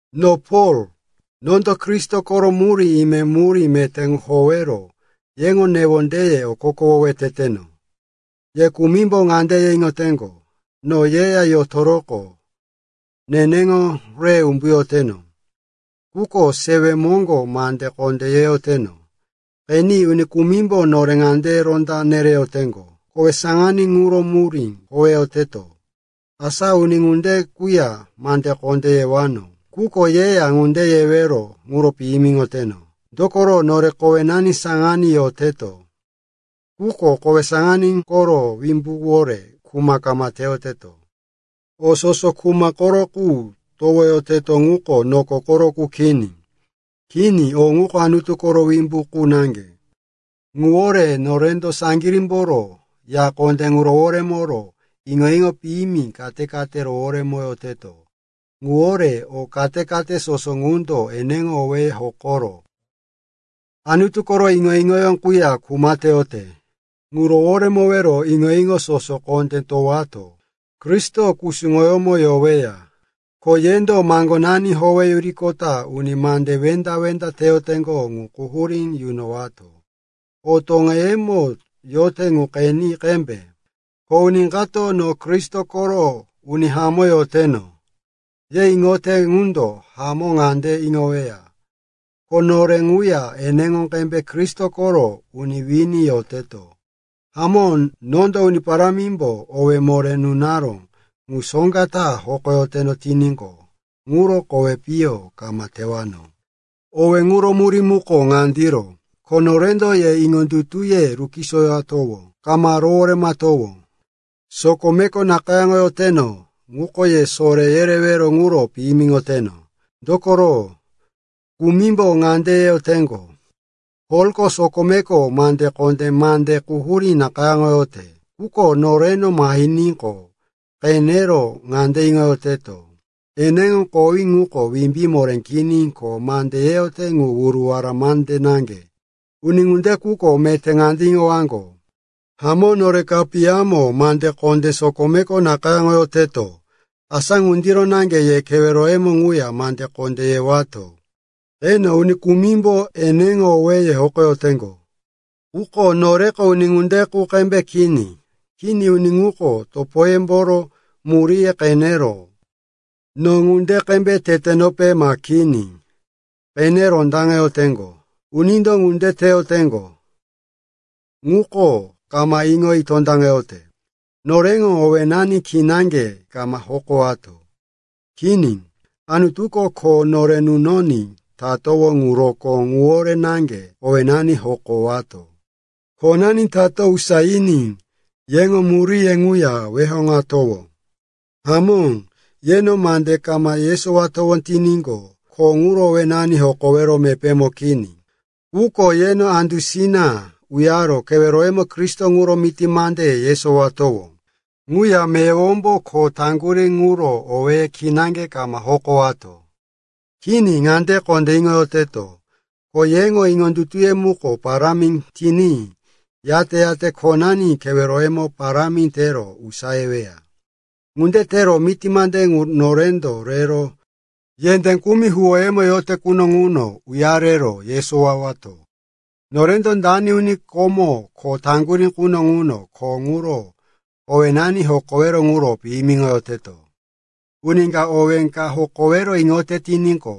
No Pol, nondo Kristo koro murí ime, murí meté ŋu howero yeŋo newondeye okokowowe teteno. Ye kumimbo ŋande ye iŋoteŋgo, no yeya yotoroqo neneŋo re umbuyoteno, quko sewe moŋgo mande kondé yeyoteno. Qeni, uni kumimbo nore ŋande ronda nereyoteŋgo, kowe saŋaní ŋuro murí howeyoteto. Asa uni ŋunde quya mande kondé yewano, quko yeya ŋunde yewero ŋuro piyimiŋoteno. Dokoro nore kowenani saŋaní yoteto, quko kowe saŋaní koro wimbuwore kuma kama teyoteto. O soso kuma koro qu towoyoteto ŋuko noko koro qu kini. Kini, o ŋuko Anutu koro wimbu qu naŋge. Ŋuwore norendo saŋgirímboro ya kondé ŋu roworemoro iŋo-iŋo piyimi kate-kate roworemoyoteto. Ŋuwore o kate-kate soso ŋundo eneŋo owéye hokoro Anutu koro iŋo-iŋo quya kuma teyote, ŋu roworemoro iŋo-iŋo soso kondé towato Kristo kusuŋoyómo yoweya. Ko yendo maŋgonani howeyuriqota uni mande wenda-wenda teyoteŋgo ŋu quhurí yunowato. O toŋeyemo yote ŋu qeni qembe. Ko uni kato, no Kristo koro uni hamó yoteno, ye iŋoyote qundo hamó ŋande iŋoweya, ko nore ŋuya eneŋo qembe Kristo koro uni wini yoteto. Hamó, nondo Uni Parámimbo owé nore nunaró ŋu soŋga ta hokoyoteno tiníqo, ŋuro kowi piyo kama tewano. Owé ŋuro murí muko ŋandiro, ko norendo ye iŋondutuye rukisoyowato, kama roworemowato. Sokome nakayáŋoyoteno ŋuko ye sore yerewero ŋuro piyimiŋoteno. Dokoro kumimbo ŋande yeyoteŋgo, “Polko sokomeko mande kondé, mande quhurí nakayáŋoyote, quko noreno mahiníqo, qenero ŋande iŋoyoteto, eneŋo kowí ŋuko wimbí moré kini ko mande yeyote ŋu wuruwara naŋge.” Uni ŋunde quko meté ŋande iŋowaŋgo, hamó nore kapiyamo mande kondé sokomeko nakayáŋoyoteto, asa ŋundiro naŋge ye keweroyemo ŋuya mande kondé yewato. Qeni, uni kumimbo eneŋo owéye hokoyoteŋgo. Quko noreko uni ŋunde qu qembe kini. Kini, uni ŋuko topoyemboro muríye qenero, no ŋunde qembe tetenope ma kini, qene rondaŋeyoteŋgo. Unindo ŋunde teyoteŋgo, ŋuko kama iŋoyi tondaŋeyote. Noreŋo owénani kinaŋge kama hokowato. Kini, Anutuko kho nore nunoní tatowó ŋu rokó ŋuwore naŋge owénani hokowato. Khonani tato usayiní yeŋo miraye ŋuya weheŋatowó. Hamó, yeno mande kama yesowatowó tiníqo, kho ŋuro owénani hokowero mepémo kini. Quko yeno andusina uyaro keweroyemo Kristo ŋuro miti mande yesowatowó. Ŋuya meyowombo kho taŋgurí ŋuro owéye kinaŋge kama hokowato. Kini, ŋande kondé iŋoyoteto, ko yeŋo iŋondutuye muko parámi tiní, yate-yate khonani keweroyemo parámi tero usayeweya. Ŋunde tero miti mande ŋu norendo rero yendé kumi huwóyemo yote quno ŋuno uyarero yesowowato. Norendo dano uni komo kho taŋgurí quno ŋuno kho ŋuro owénani hokowero ŋuro piyimiŋoyoteto. “Uni ka owé ka hokowero iŋoyote tiníqo,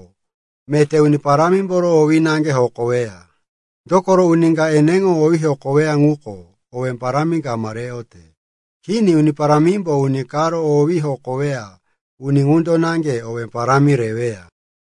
meté Uni Parámimboro owí naŋge hokoweya.” Dokoro uni ka eneŋo owí hokoweya, ŋuko owé parámi kama reyote. Kini, Uni Parámimbo uni karo owí hokoweya, uni ŋundo naŋge owé parámi reweya.